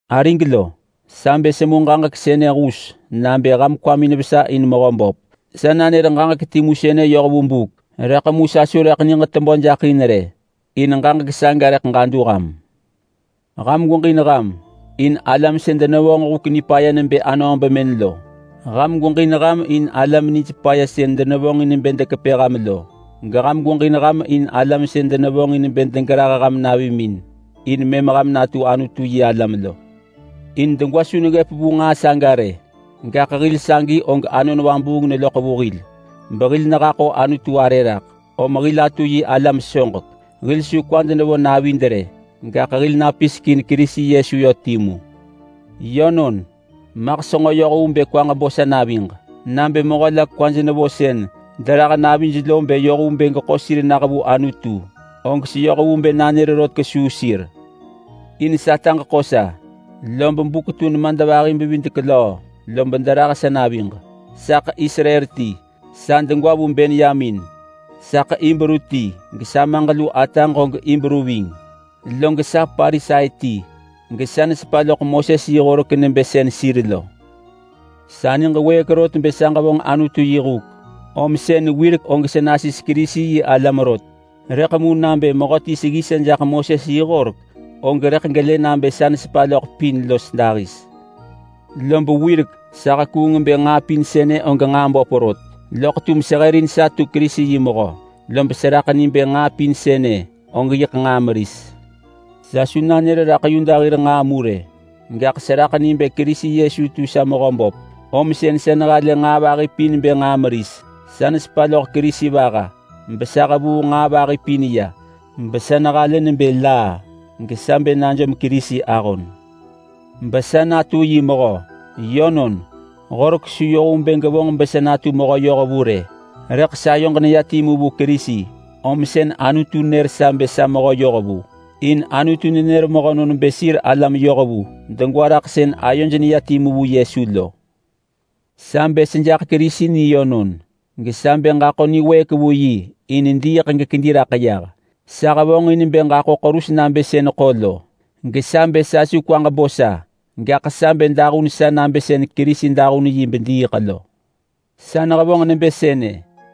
Arig lo, sa bë semu ġaġek sënë hus nabë ham kwamin vesa in Mehöböp. Sa nanër ġaġek timu sënë yoh vu buk, rëḳ mu sa su rëḳ niġ tebö jaḳ in rë, in ġaġek saga rëḳ ġadu ham. Ham gweġin ham in alam sën denevonġ huk nipaya nebë anöö bemën lo. Ham gweġin ham in alam nij paya sën denevonġin bë dekepë ham lo. Geham gweġin ham in alam sën denevonġin bë degerah ham navimin in mëm ham natu Anutu-yi-alam lo. In degwa su neggëp vu nġaa saga rë, gaḳ hil sagi og Anon Vabuung neloḳ vu hil behil nehaḳo Anutu arë raḳ, om hil atu yi alam soġek. Hil su kwad nevo navid rë, gaḳ hil napisek in Kerisi Yesu yö timu. Yönon, maḳ senġo yoh vu bë kwaġ bo sa naviġ. Nabë mehö la kwaj nevo sën derah navij lo bë yoh vu bë geḳo sir nah vu Anutu, og seyoh vu bë nanër rot kesuu sir. In sataġ ḳo sa lob buk tu nemadvahi-bevidek-löö lob derah sa naviġ. Saḳ Israel ti. Sa degwa vu Benyamin. Saḳ Hibru ti gesamaġ lu ataġ og Hibru ving. Log sa Parisai ti gesa nesepa loḳ Moses yi horek nebë sën sir lo. Sa niġ wëëk rot bë sa ġevonġ Anutu yi huk, om sën wirek og sa nasis Kerisi-yi-alam rot. Rëḳ mu nabë mehöti seggi sa jaḳ Moses yi horek, og rëḳ gelë nabë sa nesepa loḳ pin los dahis. Lob wirek sa hekuung bë nġaa pin sënë og nġaa böp rot, loḳ tum sehërin sa tu Kerisi yi mehö lob seraḳ ni bë nġaa pin sënë og yiḳ nġaa meris. Sa su nanër raḳ Yuda hir nġaa mu rë. Gaḳ seraḳ ni bë Kerisi Yesu tu sa Mehöböp, om sën sa nehalë nġaa vahi pin bë nġaa meris. Sa nesepa loḳ Kerisi vaha, besa hevuu nġaa vahi pin ya, besa nehalë nebë laa, gesa bë najom Kerisi ahon benatu yi mehö. Yönon, Horek su yoh vu bë gevonġ besa natu mehö yohvu rë. Rëḳ sayoġ neya timu vu Kerisi, om sën Anutu nër sa bë sa mehö yohvu, in Anutu nenër mehönon bë sir alam yohvu degwa raḳ sën ayoj neya timu vu Yesu lo. Sa bë sejaḳ Kerisi ni yönon. Gesa bë ġaḳo niwëëk vu yi in diiḳ gekedi raḳ yah. Sa hevonġin bë ġaḳo ḳerus nabë sën ḳo lo, gesa bë sa su kwaġ bo sa, gaḳ sa bë dahun sa nabë sën Kerisi dahun yi bediiḳ lo. Sa nehevonġ nebë sënë,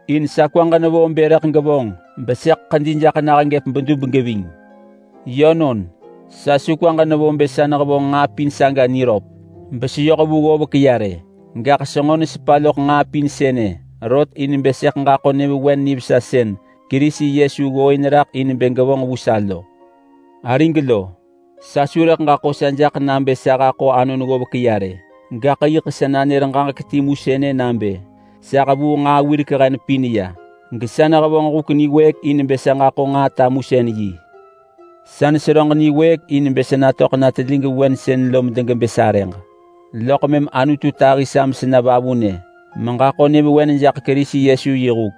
in sa kwaġ nevo bë rëḳ gevonġ besëḳ ḳedi jaḳ nah gëp bedub geving. Yönon, sa su kwaġ nevo bë sa nehevonġ nġaa pin saga niröp beseyoh vu ggovek ya rë. Gaḳ senġo nesepa loḳ nġaa pin sënë rot in bë sëḳ ġaḳo nyëvewen nivesa sën Kerisi Yesu ggooin raḳ in bë gevonġ vu sa lo. Arig lo, sa su rëḳ ġaḳo sa jaḳ nabë sa haḳo anon ggovek ya rë. Gaḳ yiḳ sa nanër ġaġek timu sënë nabë: Sa hevuu nġaa wirek hen pin ya, gesa nehevonġ huk niwëëk in bë sa ġaḳo nġaa tamusën-yi. Sa neseröġ niwëëk in bë sa natöḳ na telig vewen sën lo medegebë sarëġ, loḳ mëm Anutu tahi sa mesena vavunë meġaḳo nyëvewen jaḳ Kerisi Yesu yi huk.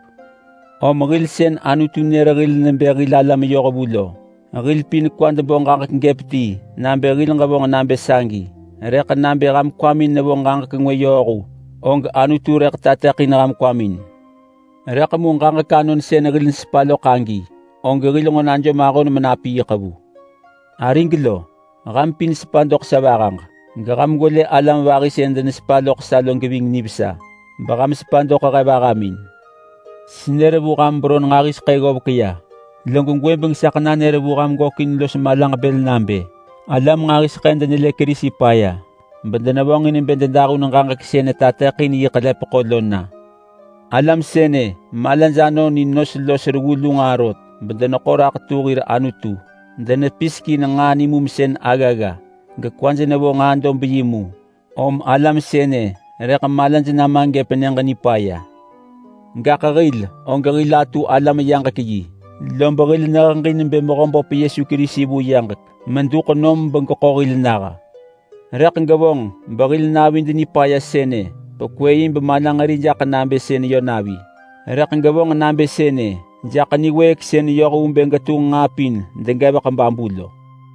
Om hil sën Anutu nër hil nebë hil alam yohvu lo, hil pin kwad bo ġaġek gëp ti nabë hil ġevonġ nabë sagi. Rëḳ nabë ham kwamin nevo ġaġek ngwë yööhu, og Anutu rëḳ tateḳin ham kwamin. Rëḳ mu ġaġek anon sën hil nesepa loḳ agi, og hil nġo najom ahon menapiiḳ vu. Arig lo, ham pin sepa doḳ sa vahaġ. Geham gwelë alam vahi sën denesepa loḳ sa lo geving nivesa, beham sepa doḳ he vahamin. Senër vu ham beron nġahiseḳë ggovek ya, log gwëbeng saḳ nanër vu ham gökin los malaġ bël nabë: Alam nġahiseḳë denelë Kerisi paya bedenevonġin bë dedahun ġaġek sën netateḳin yi ḳelepeḳo lo na. Alam sënë malaj anon in nos los reggu lu nġaa rot bedeneḳo raḳ tu hir anutu. Denepisek in nġaa nimumsën aggagga, gekwaj nevo nġaa dob yi mu. Om alam sënë rëḳ malaj nama gëp Nyëġ Nipaya. Gaḳ hil og hil atu alam-yaġek-yi, lob hil neheġin bë Mehöböp Yesu Kerisi vu yaġek meduḳ nom begeḳo hil nah. Rëḳ gevonġ behil navid nipaya sënë pekwë yi bemalanġeri jaḳ nabë sën yö navi. Rëḳ gevonġ nabë sënë jaḳ niwëëk sën yoh vu bë getunġ nġaa pin degevek babu lo.